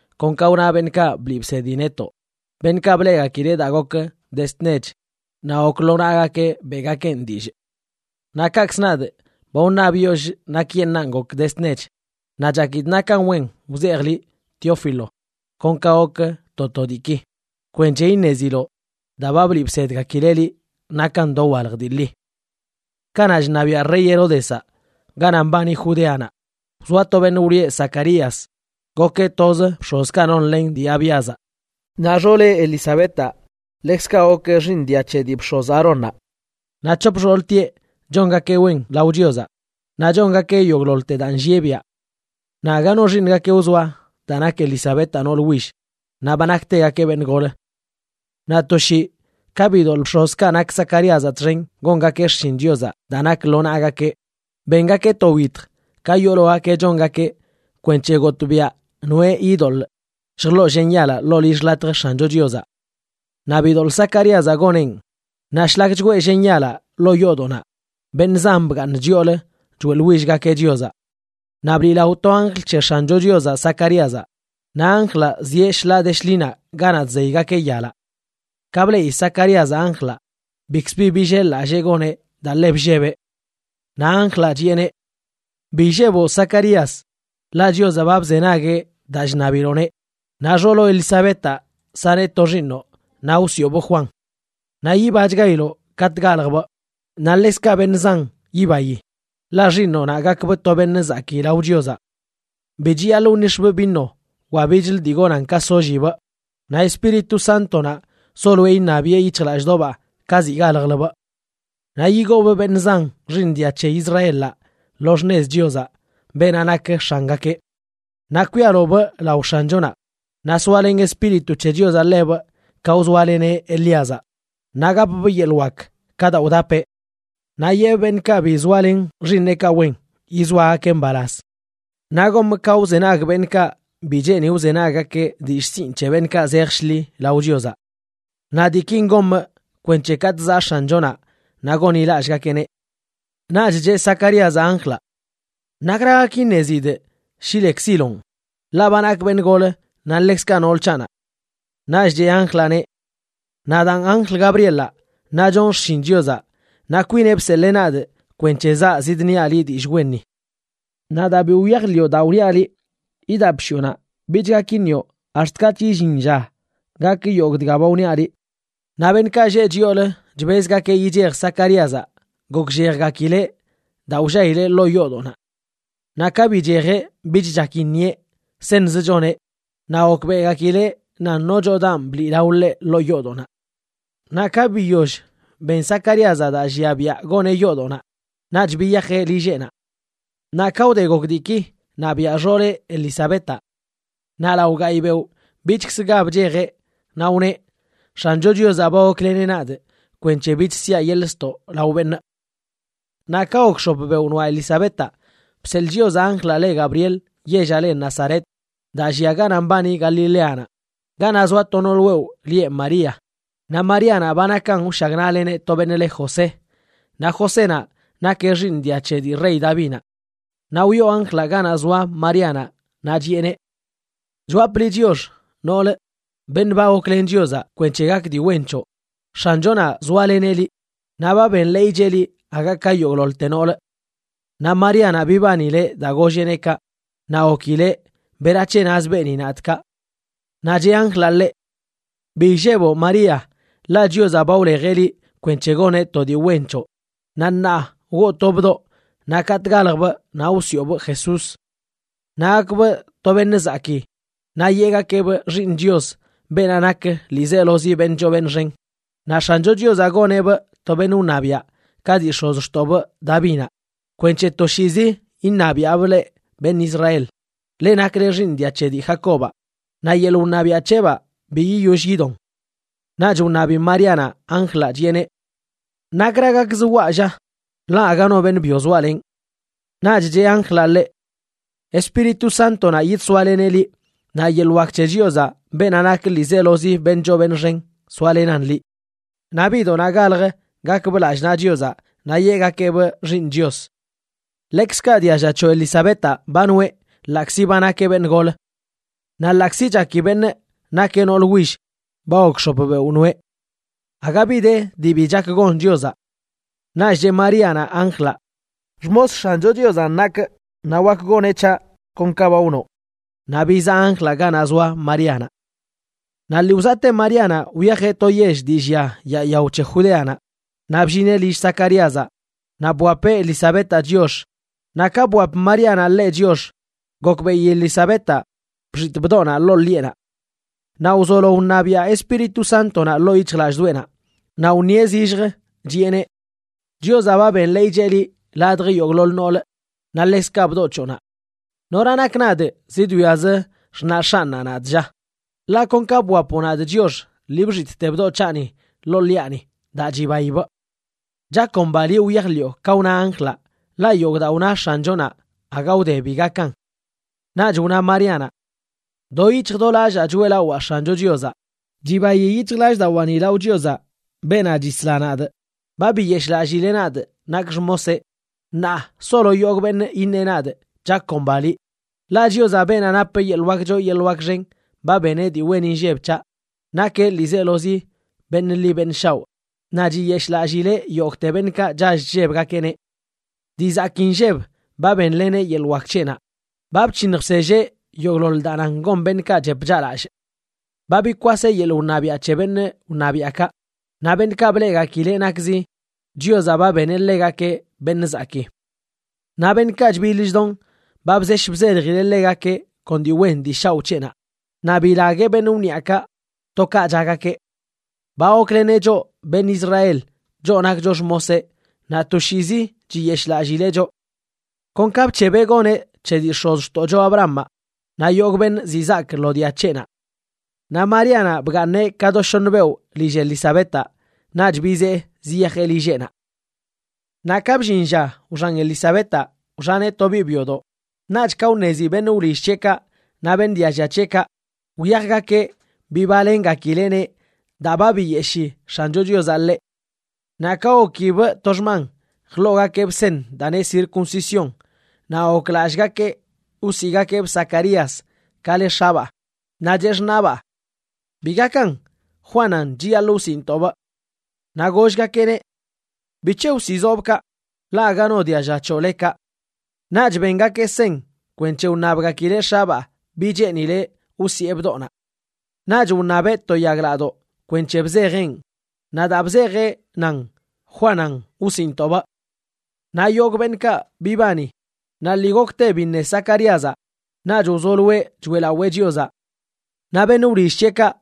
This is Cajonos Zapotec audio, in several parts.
kon ka wna beṉꞌkaꞌ bliꞌ bsedi netoꞌ, beṉꞌkaꞌ bleꞌgakileꞌ daa gok dezd nech naꞌ gok lo naꞌgakeꞌ beꞌgakeꞌn dillꞌ. Naꞌ kaꞌkz nadꞌ, ba wṉabyollꞌ nakyeṉꞌan gok dezd nech. Naꞌ chakidꞌ nakan wen wzejꞌ liꞌ, Teófilo, kon ka gok to to diiki, kwenc̱he iṉeziloꞌ daa ba bliꞌ bsedgakileꞌ liꞌ nakan dowalj dii ḻi. Kanaꞌ chṉabiaꞌ rey Heródezaꞌ ganaꞌ mbani Judeanaꞌ wzoa to beṉꞌ wlieꞌ Zacarías, gokeꞌ toz bx̱ozkaꞌ nonlen dii Abíazaꞌ. Naꞌ xooleꞌ, Elizabetaꞌ, ḻekzkaꞌ gokeꞌ xiiṉ dia c̱he dii bx̱oz Aarónnaꞌ. Naꞌ c̱hop xooltieꞌ chongakeꞌ wen lao Chiozaꞌ, naꞌ chongakeꞌ yogꞌḻoḻte daa nllieꞌ biaꞌ. Naꞌ aga no xiiṉgakeꞌ wzoa daa nak Elizabetaꞌ nool will; naꞌ ba naktegakeꞌ beṉꞌ gol. Naꞌ to shii ka bidoḻꞌ bx̱ozkaꞌ nak Zacaríazaꞌ txen gongakeꞌ xshin Chiozaꞌ daa nak lo naꞌgakeꞌ, bengakeꞌ to wyitj, ka yoologakeꞌ chongakeꞌ, kwenc̱he gotꞌbiaꞌ noeꞌ yidoḻꞌ lljḻoꞌ llen yalaꞌ ḻoo lill xḻatj X̱ancho Chiozaꞌ. Naꞌ bidoḻꞌ Zacaríazaꞌ goneꞌn. Naꞌ shlak chgwee llen yalaꞌ ḻoo yoodoꞌnaꞌ, beṉꞌ zan bgaaṉ chyoolə choeꞌḻwillgakeꞌ Chiozaꞌ. Naꞌ bliꞌlao to anjl c̱he X̱ancho Chiozaꞌ Zacaríazaꞌ, naꞌ anjlaꞌ zieꞌ shḻaa de shḻinaꞌ ganaꞌ chzeygakeꞌ yalaꞌ. Ka bleꞌi Zacaríazaꞌ anjlaꞌ, bikzə bi billel-lallee goneꞌ daa ḻe bllebeꞌ. Naꞌ anjlaꞌ chiꞌeneꞌ: ―Bi illeboꞌ Zacarías, ḻaꞌ Chiozaꞌ ba bzenagueꞌ daa chṉabiloꞌneꞌ, naꞌ xooloꞌ Elizabetaꞌ saneꞌ to xiiṉoꞌ naꞌ wsiꞌobꞌ Juan. Naꞌ yibachgailoꞌ katꞌ galjbꞌ, naꞌ ḻekzkaꞌ beṉꞌ zan yibayi, ḻaꞌ xiiṉoꞌnaꞌ gakbꞌ to beṉꞌ zakii lao Chiozaꞌ. Bi chiyaḻꞌ wnix̱bꞌ vino wa bichlə dii gonan ka sollibꞌ, naꞌ Espíritu Sántonaꞌ soloeꞌ iṉabiꞌe yic̱hjlallꞌdoꞌbaa ka ziꞌ galjləbꞌ. Naꞌ yigoobꞌ beṉꞌ zan xiiṉ dia c̱he Israelaꞌ lo xṉez Chiozaꞌ, beenaꞌ nak X̱angakeꞌ. Naꞌ kwialobꞌ lao X̱anchonaꞌ, naꞌ soalen Espíritu c̱he Chiozaꞌ ḻebꞌ ka wzoaleneꞌ Elíazaꞌ, naꞌ gapbꞌ yeḻꞌ wak ka daa wdapeꞌ. Naꞌ yeꞌbꞌ beṉꞌkaꞌ bi zoalen xiiṉeꞌkaꞌ wen, yizoagakeꞌ mbalaz. Naꞌ gomꞌ ka wzenag beṉꞌkaꞌ bi cheeni wzenaggakeꞌ dillꞌ sinꞌ c̱he beṉꞌkaꞌ zej shḻi lao Chiozaꞌ. Naꞌ diikin gomꞌ kwenc̱he katꞌ zaꞌ X̱anchonaꞌ naꞌ gonḻilallꞌgakeꞌneꞌ. Naꞌch cheꞌ Zacaríazaꞌ anjlaꞌ: ―¿Nakra gak iṉezidꞌ shi lekziloꞌn?, ḻaꞌ ba nakꞌ beṉꞌ gol naꞌ ḻekzkaꞌ nool c̱haꞌnaꞌ. Naꞌch cheꞌ anjlaꞌneꞌ: ―Nadaan anjl Gabrielaꞌ, naꞌ chonꞌ xshin Chiozaꞌ, naꞌ kwineꞌ bseḻee nadꞌ kwenc̱he zaa zidniaꞌ liꞌ dillꞌ wenni. Naꞌ daa bi wyajḻiꞌo daa wniaꞌ liꞌ, idap shiꞌonaꞌ. Bich gak iṉioꞌ ax̱t katꞌch illin lla gak yogꞌ dga ba wniaꞌ liꞌ. Naꞌ beṉꞌkaꞌ lleꞌ chyoolə chbezgakeꞌ yichej Zacaríazaꞌ, gokllejgakileꞌ daa wllaileꞌ ḻoo yoodoꞌnaꞌ. Naꞌ ka bichejeꞌ bich chak iṉieꞌ, seṉzə choneꞌ, naꞌ gokbeꞌgakileꞌ nan nochodanꞌ bliꞌlao ḻeꞌ ḻoo yoodoꞌnaꞌ. Naꞌ ka biyoll ben Zacaríazaꞌ daa llia biaꞌ goneꞌ yoodoꞌnaꞌ, naꞌch biyajeꞌ lilleꞌnaꞌ. Naꞌ ka wde gok diiki, naꞌ biaꞌ xooleꞌ, Elizabetaꞌ. Naꞌ lao gayꞌ beoꞌ bichkzə ga bchejeꞌ, naꞌ wneꞌ: “X̱ancho Chiozaꞌ ba gokleneꞌ nadꞌ kwenc̱he bich siaꞌ yeḻꞌ ztoꞌ lao beṉꞌ.” Naꞌ ka gok x̱op beoꞌ noaꞌ Elizabetaꞌ, bseḻꞌ Chiozaꞌ anjlaꞌ le Gabriel yellaꞌ le Nazaret daa llia ganaꞌ mbani Galileanaꞌ, ganaꞌ zoa to nool wewꞌ lieꞌ María. Naꞌ Maríanaꞌ ba nakan wshagnaꞌleneꞌ to beṉꞌ le José, naꞌ Josénaꞌ nakeꞌ xiiṉ dia c̱he dii rey Davinaꞌ. Naꞌ wyoo anjlaꞌ ganaꞌ zoa Maríanaꞌ naꞌ chiꞌeneꞌ: ―¡Chwapꞌ liꞌ chiox, nool, beṉꞌ ba goklen Chiozaꞌ kwenc̱he gak dii wen c̱hoꞌ! X̱anchonaꞌ zoaleneꞌ liꞌ, naꞌ ba benḻeeycheꞌ liꞌ aga ka yogꞌḻoḻte nool. Naꞌ Maríanaꞌ bibanileꞌ daa golleꞌneꞌ kaꞌ, naꞌ gokileꞌ berac̱he naz beeni nadꞌ kaꞌ. Naꞌ cheꞌ anjlaꞌ ḻeꞌ: ―Bi illeboꞌ María, ḻaꞌ Chiozaꞌ ba wlejeꞌ liꞌ kwenc̱he goneꞌ to dii wen c̱hoꞌ. Naꞌ ṉaa woo to bdoꞌ naꞌ katꞌ galjbꞌ naꞌ wsiꞌobꞌ Jesús. Naꞌ gakbꞌ to beṉꞌ zakii naꞌ yeꞌgakeꞌbꞌ Xiiṉ Chios, beenaꞌ nak ḻiizelozi beṉꞌ choo beṉꞌ xen. Naꞌ X̱ancho Chiozaꞌ goneꞌbꞌ to beṉꞌ wṉabiaꞌ ka dii x̱ozxtoꞌbꞌ Davinaꞌ kwenc̱he toshiizi iṉabiaꞌbꞌ leꞌ beṉꞌ Israel, leꞌ nakle xiiṉ dia c̱he dii Jacobaꞌ, naꞌ yeḻꞌ wṉabiaꞌ c̱heꞌbaa bi yiyoll yidon. Naꞌch wṉabi Maríanaꞌ anjlaꞌ, chiꞌeneꞌ: ―¿Nakra gakz waꞌ, lla?, ḻaꞌ aga no beṉꞌ byo zoalenꞌ. Naꞌch cheꞌ anjlaꞌ ḻeꞌ: ―Espíritu Sántonaꞌ yidsoaleneꞌ liꞌ, naꞌ yeḻꞌ wak c̱he Chiozaꞌ, beenaꞌ nak ḻiizelozi beṉꞌ choo beṉꞌ xen, soalenan liꞌ. Naꞌ biꞌdoꞌnaꞌ galj gakbꞌ lallꞌ naꞌ Chiozaꞌ naꞌ yeꞌgakeꞌbꞌ Xiiṉ Chios. Ḻekzkaꞌ dialla c̱hoꞌ Elizabetaꞌ ba noꞌe, ḻaꞌkzi ba nakeꞌ beṉꞌ gol. Naꞌ ḻaꞌkzi chaki beṉꞌ nakeꞌ nool will, ba gok x̱op beoꞌ noꞌe. Aga bi de dii bi chak gon Chiozaꞌ. Naꞌch cheꞌ Maríanaꞌ anjlaꞌ: ―Xmos X̱ancho Chiozanꞌ nakꞌ, naꞌ wak goneꞌ c̱haꞌ kon ka ba wnoꞌ. Naꞌ bizaꞌ anjlaꞌ ganaꞌ zoa Maríanaꞌ. Naꞌ lii wzaꞌte Maríanaꞌ wyajeꞌ to yell dii llia yaa yao c̱he Judeanaꞌ. Naꞌ bllineꞌ lill Zacaríazaꞌ naꞌ bwapeꞌ Elizabetaꞌ chiox. Naꞌ ka bwap Maríanaꞌ ḻeꞌ chiox, gokbeꞌi Elizabetaꞌ bxitꞌ bdoꞌnaꞌ ḻoo ḻiꞌenaꞌ. Naꞌ wzolo wṉabiaꞌ Espíritu Sántonaꞌ ḻoo yic̱hjlallꞌdoꞌenaꞌ, naꞌ wṉieꞌ zillj, chiꞌeneꞌ: ―Chiozaꞌ ba benḻeeycheꞌ liꞌ ladj yogꞌḻoḻ nool, naꞌ ḻekzkaꞌ bdoꞌ c̱hoꞌnaꞌ. ¿Nora nakꞌ nadꞌ zidwiaꞌzə xṉaꞌ X̱anꞌnaꞌ nadꞌ, lla? Ḻaꞌ kon ka bwapoꞌ nadꞌ chiox, lii bxitꞌte bdoꞌ c̱haꞌni ḻoo ḻiꞌani daa chibaibꞌ. Chakomba liꞌ wyajḻiꞌo ka wna anjlaꞌ, ḻaꞌ yogꞌ daa wna X̱anchonaꞌ, aga wde bi gakan. Naꞌch wna Maríanaꞌ: Do yic̱hj do lallaa choeꞌlawaa X̱ancho Chiozaꞌ. Chibayi yic̱hjlallꞌdawaani lao Chiozaꞌ, beenaꞌ chisla nadꞌ. Ba biyeshꞌlallileꞌ nadꞌ nakꞌ xmoseꞌ, ṉaa solo yogꞌ beṉꞌ iṉeꞌ nadꞌ: “Chakomba liꞌ.” Ḻaꞌ Chiozaꞌ, beenaꞌ nap yeḻꞌ wak choo yeḻꞌ wak xen, ba beneꞌ dii wen inlleb c̱haꞌ. Nakeꞌ ḻiizelozi beṉꞌ ḻi beṉꞌ shaoꞌ, naꞌ chiyeshꞌlallileꞌ yogꞌte beṉꞌkaꞌ chall chllebgakeꞌneꞌ. Dii zakii nlleb ba benleneꞌ yeḻꞌ wak c̱heꞌnaꞌ. Ba bc̱hiṉj bselleꞌ yogꞌḻoḻ daa nan gon beṉꞌkaꞌ chep chaꞌlallꞌ. Ba bikwaseꞌ yeḻꞌ wṉabiaꞌ c̱he beṉꞌ wṉabiaꞌkaꞌ, naꞌ beṉꞌkaꞌ bleꞌgakileꞌ nakzi, Chiozaꞌ ba beneꞌ ḻegakeꞌ beṉꞌ zakii. Naꞌ beṉꞌkaꞌ chbiḻ chdon, ba bzesh bzeljileꞌ ḻegakeꞌ kon dii wen dii shaoꞌ c̱heꞌnaꞌ, naꞌ bilagueꞌ beṉꞌ wniꞌakaꞌ to ka chaꞌgakeꞌ. Ba gokleneꞌ choꞌ beṉꞌ Israel, choꞌ nakcho xmoseꞌ, naꞌ toshiizi chiyeshꞌlallileꞌ choꞌ, kon ka bc̱hebeꞌ goneꞌ c̱he dii x̱ozxtoꞌcho Abrahamaꞌ naꞌ yogꞌ beṉꞌ zizaak lo dia c̱heꞌnaꞌ. Naꞌ Maríanaꞌ bgaaṉeꞌ ka do shoṉ beoꞌ lill Elizabetaꞌ, naꞌch bizee ziyajeꞌ lilleꞌnaꞌ. Naꞌ ka bllin lla wxan Elizabetaꞌ, wxaneꞌ to biꞌ byodoꞌ. Naꞌch ka wṉezi beṉꞌ wlill c̱heꞌkaꞌ naꞌ beṉꞌ dialla c̱heꞌkaꞌ, wyajgakeꞌ bibalengakileꞌneꞌ daa ba biyeshii X̱ancho Chiozaꞌ ḻeꞌ. Naꞌ ka gokibꞌ to xman, jḻoogakeꞌbꞌ seṉ daa neꞌ circuncisión, naꞌ goklallꞌgakeꞌ wsiꞌgakeꞌbꞌ Zacarías ka le x̱abaa. Naꞌ cheꞌ xṉaꞌbaa: ―¡Bi gakan! Juanan chiyaḻꞌ wsiꞌntoꞌbꞌ. Naꞌ gollgakeꞌneꞌ: ―¿Bic̱he wsiꞌzoꞌbꞌ kaꞌ? Ḻaꞌ aga no dialla c̱hoꞌ le kaꞌ. Naꞌch bengakeꞌ seṉ kwenc̱he wṉabgakileꞌ x̱abaa bi cheenileꞌ wsiꞌe bdoꞌnaꞌ. Naꞌch wṉabeꞌ to yaglaꞌdoꞌ kwenc̱he bzejeꞌn, naꞌ daa bzejeꞌ nan: “Juanan wsiꞌntoꞌbꞌ.” Naꞌ yogꞌ beṉꞌkaꞌ bibani. Naꞌ lii gokte biṉe Zacaríazaꞌ, naꞌch wzoloeꞌ choeꞌlawee Chiozaꞌ. Naꞌ beṉꞌ wlill c̱heꞌkaꞌ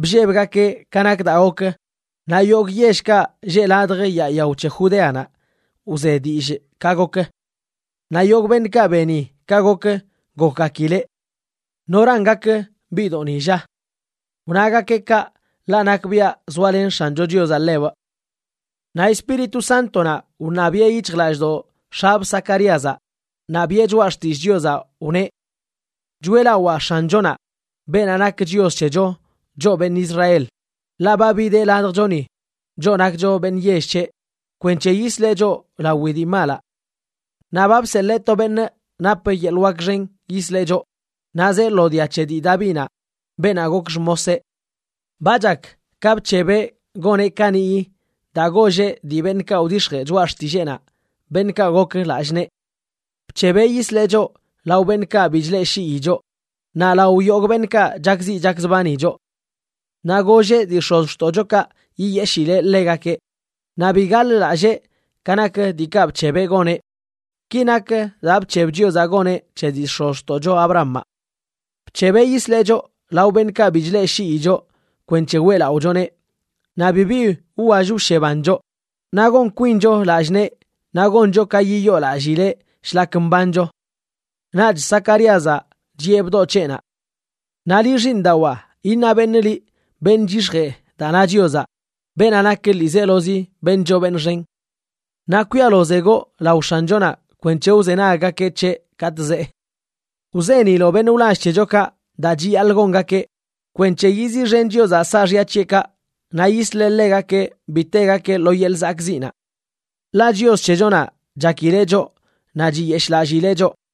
bllebgakeꞌ ka nak daa gok, naꞌ yogꞌ yellkaꞌ lleꞌ ladj yaa yao c̱he Judeanaꞌ wze dillꞌ ka gok. Naꞌ yogꞌ beṉꞌkaꞌ beni ka gok, gokgakileꞌ: ―¿Noran gak biꞌdoꞌni, lla? Wnagakeꞌ kaꞌ, ḻaꞌ nakbiaꞌ zoalen X̱ancho Chiozaꞌ ḻebꞌ. Naꞌ Espíritu Sántonaꞌ wṉabiꞌe yic̱hjlallꞌdoꞌ x̱abꞌ Zacaríazaꞌ naꞌ biꞌe choꞌa xtillꞌ Chiozaꞌ, wneꞌ: Choeꞌlawaa X̱anchonaꞌ, beenaꞌ nak Chios c̱hecho, choꞌ beṉꞌ Israel, ḻaꞌ ba bideꞌ ladjchoni, choꞌ nakcho beṉꞌ yell c̱heꞌ, kwenc̱he yisleꞌ choꞌ lawi dii malaꞌ. Naꞌ ba bseḻee to beṉꞌ nap yeḻꞌ wak xen yisleꞌ choꞌ, naꞌ zee lo dia c̱he dii Davinaꞌ, beenaꞌ gok xmoseꞌ. Ba chak ka bc̱hebeꞌ goneꞌ kaniꞌyi daa golleꞌ dii beṉꞌkaꞌ wdix̱jee choꞌa xtilleenaꞌ, beṉꞌkaꞌ gok lallꞌ nee. Bc̱hebeꞌ yisleꞌ choꞌ lao beṉꞌkaꞌ bi chleꞌshii choꞌ, naꞌ lao yogꞌ beṉꞌkaꞌ chakziꞌ chakzbani choꞌ. Naꞌ golleꞌ dii x̱ozxtoꞌchokaꞌ yiyeshileꞌ ḻegakeꞌ, naꞌ bi gaḻ-lallee ka nak diikaꞌ bc̱hebeꞌ goneꞌ. Ki nak daa bc̱heb Chiozaꞌ goneꞌ c̱he dii x̱ozxtoꞌcho Abrahamaꞌ: Bc̱hebeꞌ yisleꞌ choꞌ lao beṉꞌkaꞌ bi chleꞌshii choꞌ kwenc̱he weꞌlaꞌochoneꞌ naꞌ bibi wwall wsheban choꞌ, naꞌ gon kwincho lallꞌ nee naꞌ goncho ka yiyoolallileꞌ shlak mbancho. Naꞌch Zacaríazaꞌ chiꞌe bdoꞌ c̱heꞌnaꞌ: Naꞌ liꞌ, xiiṉdawaa, iṉa beṉꞌ liꞌ beṉꞌ chyix̱jee daa na Chiozaꞌ, beenaꞌ nak ḻiizelozi beṉꞌ choo beṉꞌ xen. Naꞌ kwialozegoꞌ lao X̱anchonaꞌ kwenc̱he wzenaggakeꞌ c̱heꞌ katꞌ zee. Wzeniloꞌ beṉꞌ wlall c̱hechokaꞌ daa chiyaḻꞌ gongakeꞌ kwenc̱he yiziꞌxen Chiozaꞌ saaxya c̱heꞌkaꞌ naꞌ yisleꞌ ḻegakeꞌ bi tegakeꞌ lo yeḻꞌ zakꞌziꞌnaꞌ. Ḻaꞌ Chios c̱hechonaꞌ chakileꞌ choꞌ naꞌ chiyeshꞌlallileꞌ choꞌ,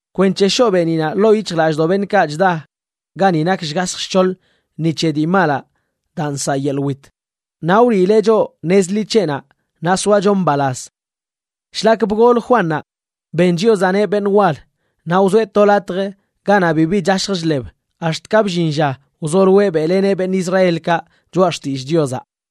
kwenc̱he shoꞌ beeniꞌnaꞌ ḻoo yic̱hjlallꞌdoꞌ beṉꞌkaꞌ chda gani nak shgasj shc̱hoḻ ni che dii malaꞌ daa nsaꞌ yeḻꞌ wit, naꞌ wliileꞌ choꞌ nez ḻi c̱heꞌnaꞌ naꞌ soacho mbalaz. Shlak bgol Juannaꞌ, ben Chiozaꞌneꞌ beṉꞌ wal. Naꞌ wzoeꞌ to latj ganaꞌ bibi chashj chḻeb ax̱t ka bllin lla wzoloeꞌ beꞌleneꞌ beṉꞌ Israelkaꞌ choꞌa xtillꞌ Chiozaꞌ.